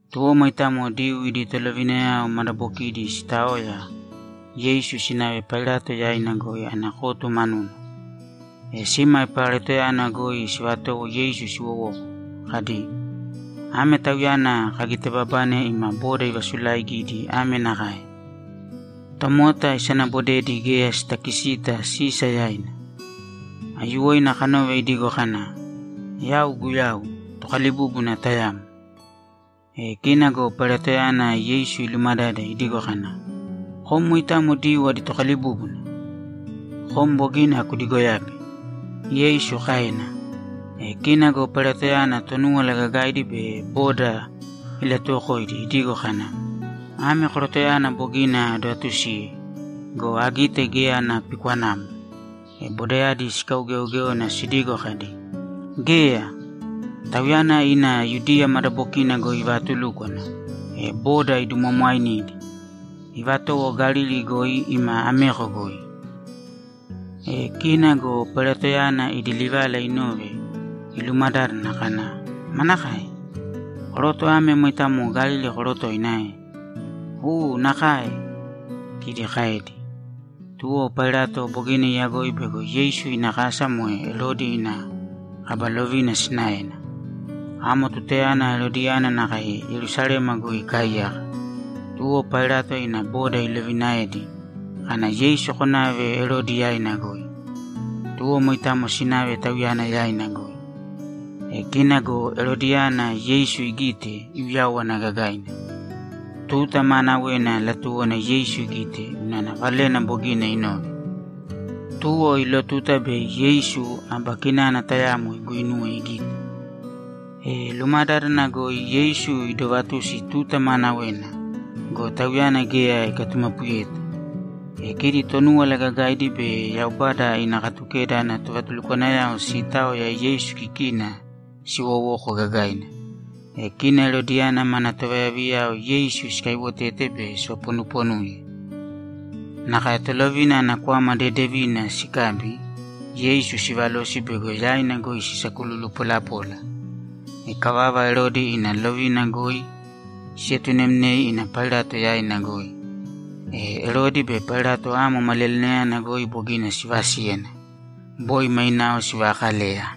Tuwo moitamo Diyuu idi tolovinayao madabokidi sitaoya, Yeisu sinave Pailato yaina goi ana kotu manuna. E sima Pailatoyana goi sivatowo Yeisu siwowoko kadi, ‘Ame Tauyana kagitebabane ima boda ivasulaigidi ame nakae: Tomota isanabodedi geya sitakisita Sisa yaina. Aiyuwoina kanove idigo kana, “Yau Guyau, Tokalibúbuna tayamo.”’ E kina go Pailatoyana Yeisu ilumadade idigo kana, ‘Kom moitamo Diyuu adi Tokalibúbuna?’ ‘Kom bogina kudigoyabe’, Yeisu kaena. E kina go Pailatoyana Tonúwala Gagaidi be boda ilatuwokoidi idigo kana, ‘Ame korotoyana bogina adovatusiye go, agite geya ana pikwanamo.’ E bodayadi sikaugeogéona sidigo kadi, ‘Geya! Tauyana ina Yudiya madabokina goi ivaatulúkwana, e boda idumwamwainidi. Ivatowo Galili goi ima ameko goi.’ E kina go Pailatoyana idi livala inove, ilumadádana kana, ‘Manakae? Koroto ame moitamo Galili korotoina ae?’ ‘U, nakae’, kidi kaedi. Tuwo Pailato bogina iyagoi bego Yeisu ina kasa moe Erodi ina kaba lovina sinaena. Amo tutayana Erodiyana nakae Yerusalema goi ikaaiyaka, tuwo Pailato ina boda ilovinaedi kana, ‘Yeisu konave Erodi yaina goi.’ Tuwo moitamo sinave tauyana yaina goi. E kina go Erodiyana Yeisu igite, iuyáwana gagaina. Tuta maanawena latuwona Yeisu igite unana valena bogina inove. Tuwo iilotuta bei Yeisu aba kinana tayamo iguuinuwe igite. E lumadádana goi Yeisu idoovatusi tuta maanawena go, Tauyana geya ikatumapuyeta. E kidi Tonúwala Gagaidi be Yaubada ina Katukeda ana tovatulukwanayao siitaoya Yeisu kikina siwowoko gagaina. E kina Erodiyana mana tovayaviyayao Yeisu sikaiwotete be sivaponuponuye. Nakae tolovina ana kwama dedevina sikabi, Yeisu sivalosi bego yaina goi sisakululu polapola. Ikavava, Erodi ina lovina goi sietunemnei ina Pailato yaina goi. E Erodi be Pailato amo maliyalinayana goi bogina sivasíyana. Boi mainao sivaakaleya.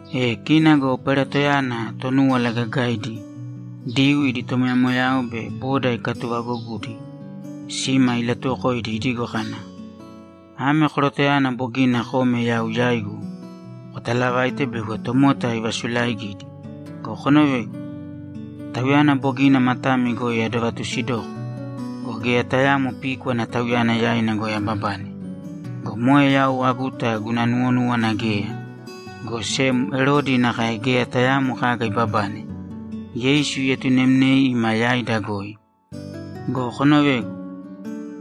E kina go Pailatoyana Tonúwala Gagaidi, Diyuu idi tomoyamoyayao be boda ikatuvagogudi sima ilatuwokoidi idigo kana, ‘Ame korotoyana bogina kome yau yaigu kotalavaite bego tomota ivasulaigidi go, konovēgu. Tauyana bogina matami goi adovatusidoko go, geya tayaamo píkwana Tauyana yaina goi ababane. Go moe yau aguta guna nuwonúwana geya, go sem Erodi nakae geya tayaamo kaga ibabane. Yeisu ietunemnei ima yaida goi. Go konovēgu.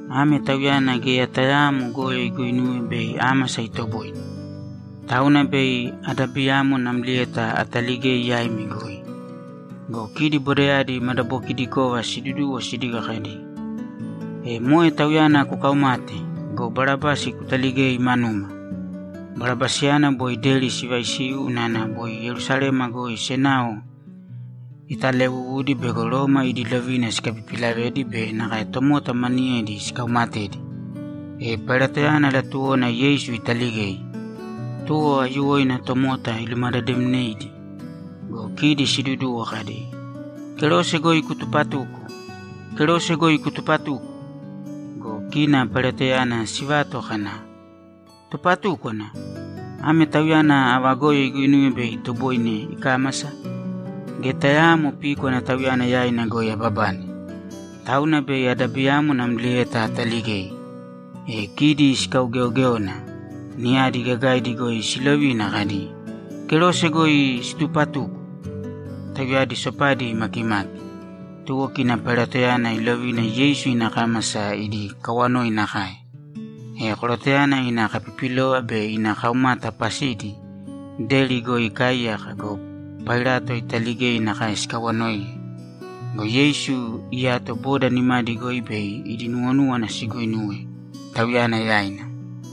Ame Tauyana geya tayaamo goyo iguinuwe bei ámasa itoboine. Tauna bei adabiyamo namlieta ataligei yaimi goi.’ Go kidi bodayadi madabokidikova siduduwo sidigo kadi, ‘E moe Tauyana kukaumāte go, Barabasi kutaligēi manuma!’ Barabasiyana boi deri sivaisiu unana boi Yerusalema goi senao italewuwudi bego Roma idi lovina sikapipilavedi be nakae tomota maniyedi ikaumatedi. E Pailatoyana latuwona Yeisu italigei, tuwo aiyuwoina tomota ilumadademneidi. Go kidi siiduduwo kadi, ‘Kerose goi kutupatūko! Kerose goi kutupatūko!’ Go kina Pailatoyana sivato kana, ‘Tupatúkwana? Ame Tauyana ava goyo iguinuwe bei itoboine ikámasa? Geya tayaamo píkwana Tauyana yaina goi ababane. Tauna bei adabiyamo namlieta ataligei.’ E kidi sikaugeogéona. Niyadi gagaidi goi silovina kadi, ‘Kerose goi situpatuko!’ Tauyadi sopadi imakimaki, tuwo kina Pailatoyana ilovina Yeisu ikámasa idi kawanoi nakae. E korotoyana ina kapipilova be ina kaumata pasidi deri goi ikaaiyaka go, Pailato italigei nakae sikawanoiye. Go Yeisu iyato boda nimadi goi bei idi nuwonúwana siguinuwe Tauyana yaina.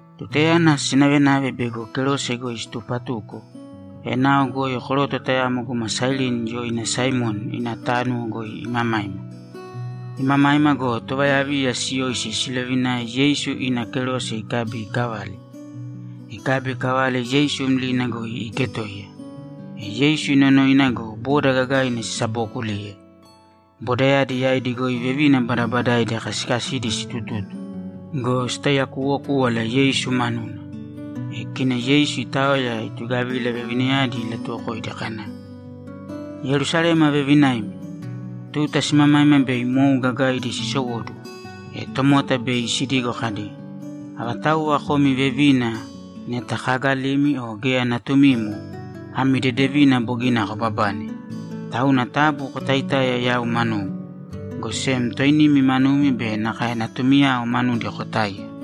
Tutayana sinavenave bei kerose goi situpatuko, enao goi koroto tayamo guma Sairini yoina Saimoni ina tánuwo goi imamaima. Imamaima go, tovayaviya siyoisi silovinae Yeisu ina kerose ikabi ikavale. Ikabi ikavale Yeisu mlina goi iiketoiya. E Yeisu inonoina go, boda gagaina sisabookuliye. Bodayadi yaidi goi vevina badabadaidi kasikasidi sitututu go, sitaiyakuwokúwala Yeisu manuna. E kina Yeisu itaoya, itugavila vevinayadi ilatuwokoidi kana, ‘Yerusalema vevinaimi, tuta simamaima bei mou gagaidi sisowóduwo, e tomota bei sidigo kadi, “Avatauwa komi vevina neta kaagalimi o geya natumimo, ami dedevina bogina kobabane.” Tauna taabu kotaitāiya yau manugu, go sem toinimi manumi be nakae natumiyao manudi kotāiya.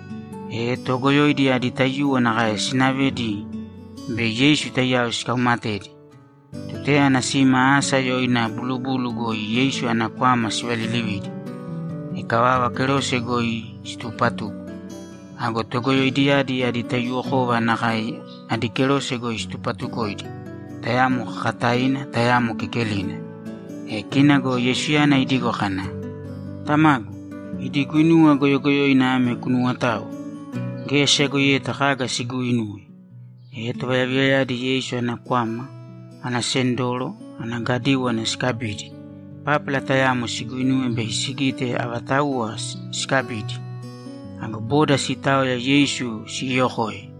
E toogoyoidi adi taiyuwo nakae sinavedi bei Yeisu taiyao sikaumatedi. Tutayana sima asa yoina Bulubulu goi Yeisu ana kwama sivalilividi. Ikavava, kerose goi situpatuko. Ago togoyoidiyadi adi taiyuwokova nakae adi kerose goi situpatukoidi, tayamo kakataina, tayamo kekelina. E kina go Yeisuyana idigo kana, ‘Tamagu, idi guinuwa goyogoyoina ame kunuwotāo. Geya siyagoiyeta kaga siguuinuwe.’ E tovayaviyayadi Yeisu ana kwama, ana sendoro, ana gadíwana sikabidi, pápala tayamo siguinuwe bei sigite avatauwa sikabidi. Ago boda siitaoya Yeisu siyookoe.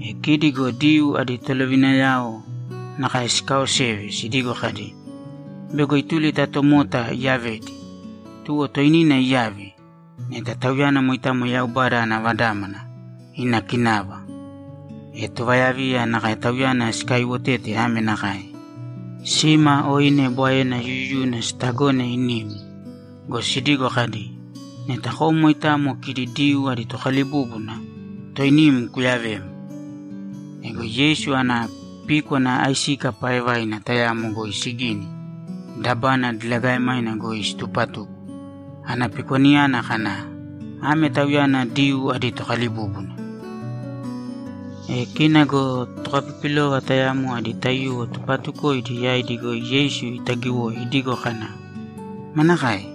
E kidi go Diyuu adi tolovinayaoyadi nakae sikaoseve sidigo kadi, ‘Bego ituli ta tomota iyavedi. Tuwo toinina iyāve, neta Tauyana moitamo Yaubada ana Vadámana, ina kinava!’ E tovayaviya nakae Tauyana sikaiwotete ame nakae: Sima oine bwaena yuyuyuna sitagone inim go, sidigo kadi, ‘Neta kom moitamo kidi Diyuu adi Tokalibúbuna, toinim kuyavēm!’ Ego Yeisu ana píkwana aisika paaevaina tayamo goi sigini, dabana diligaemaina goi situpatuko. Ana pikwanayana kana, ‘Ame Tauyana Diyuu adi Tokalibúbuna.’ E kina go tokapipilova tayamo adi taiyuwo tupaatukoidi yaidi goi Yeisu itagiwoi idigo kana, ‘Manakae?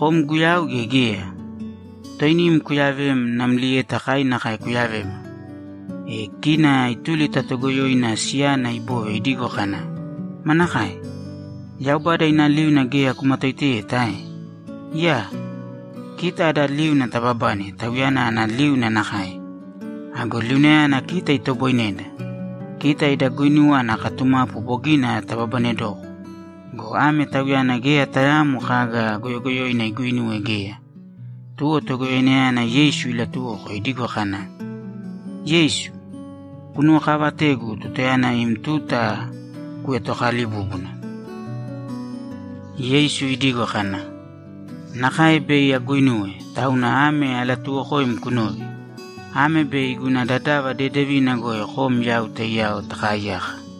Kom Guyau gea geya? Toinim kuyavēm namlieta kai nakae kuyavēma.’ E kina ituli ta toogoyoina siyana ibove idigo kana, ‘Manakae? Yaubada ina liuna geya kumatoiteyeta ae? Iyaa! Kita ada liuna taababane Tauyana ana liuna nakae! Ago liunayana kita itoboineda. Kita ida guinuwa ana katumapu bogina tababanedoko go, ame Tauyana geya tayaamo kaga goyogoyoina iguinuwe geya.’ Tuwo togoyoinayana Yeisu ilatuwoko idigo kana, ‘Yeisu, kunuwokavatēgu tutayana im tuta kuetokalibúbuna.’ Yeisu idigo kana, ‘Nakae bei aguinuwe, tauna ame alatuuwokoim kunōve: Ame bei guna dadava dedevina goi kom yau taiyao takaaiyaka.’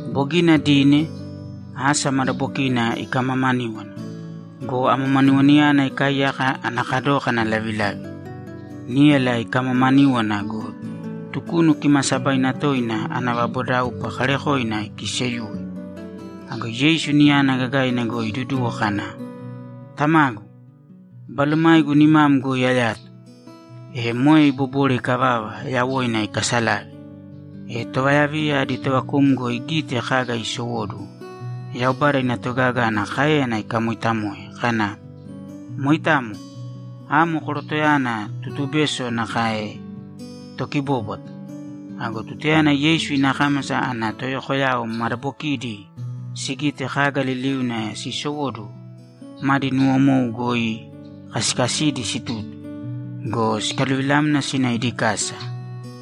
Bogina dine, asa madabokina ikamamaníwana go, amamaniwanayana ikaaiyaka ana kadókana lavilavi. Níyala ikamaamaníwana go, Tukunu Kimaasabaina Toina ana vabodaupa kaarekoina ikiiseyuwe. Ago Yeisu niyana gagaina goi iduduwo kana, ‘Tamagu, balomaigu nimam goi ayato!’ E moe ibobore ikavava, yawoina ikasalave. E tovayaviya adi tovakumgo igite kaga iisowóduwo, Yaubada ina togaga ana káeyana ikamooitamoe kana, ‘Moitamo. Amo korotoyana tutubeso nakae tokibóbwata.’ Ago tutayana Yeisu ina kámasa ana toyokoyao madabokidi sigite kaga liliuna siisowóduwo, madi nuwomou goi kasikasidi situtu go, sikaluvilamna sina idi kasa.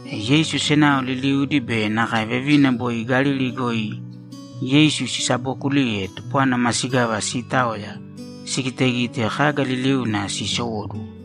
E Yeisu senao liliudi be nakae vevina boi Galili goi Yeisu sisabookuliye tupwana masigava siitaoya sigitegite kaga liliuna siisowóduwo.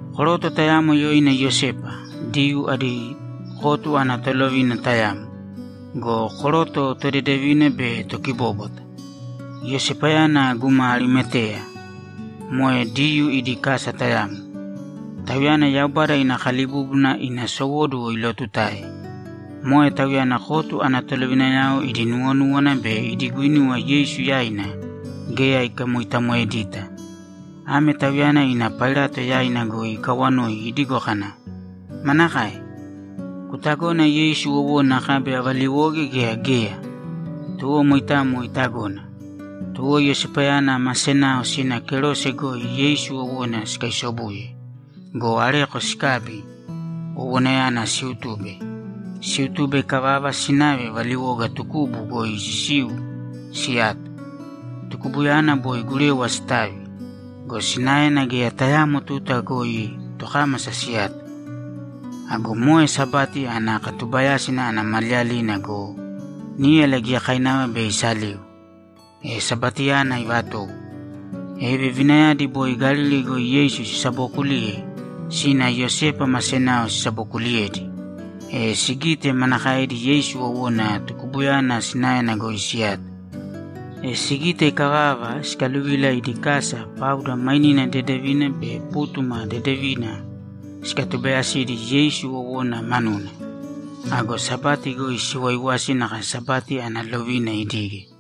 Koroto tayamo yoina Iyosepa, Diyuu adi kotu ana tolovina tayamo go, koroto todedevina be tokibóbwata. Iyosepayana guma Arimateya, moe Diyuu idi kasa tayamo. Tauyana Yaubada ina kalibúbuna ina sowóduwo ilootutae. Moe tauyana kotu ana tolovinayao idi nuwonúwana be idi guinuwa Yeisu yaina geya ikamoitamoedita. Ame tauyana ina Pailato yaina goi ikawanoi idigo kana, ‘Manakae? Kutagona Yeisu wowona akabi avaliwoge gea geya?’ Tuwo moitamo itagona. Tuwo Iyosepayana ma senao sina kerose goi Yeisu wowona sikaisobuye go, areko sikabi, wowonayana siutube. Siutube ikavava, sinave valiwoga tukubu goi sisiu siyato. Tukubuyana boi gurewa sitavi go, sinaena geya tayaamo tuta goi tokámasa siyato. Ago moe Sabati ana katubayásina ana maliyalina go, níyala giyakainava bei isaliu, e Sabatiyana ivatowo. E vevinayadi boi Galili goi Yeisu sisabookuliye, sina Iyosepa ma senao sisabokuliyedi, e sigite manakaedi Yeisu wowona tukubuyana sinaena goi siyato. E sigite ikavava, sikaluvila idi kasa pauda mainina dedevina be pútuma dedevina sikatubayasidi Yeisu wowona manuna. Ago Sabati goi siwaiwasi nakae Sabati ana lovina idige.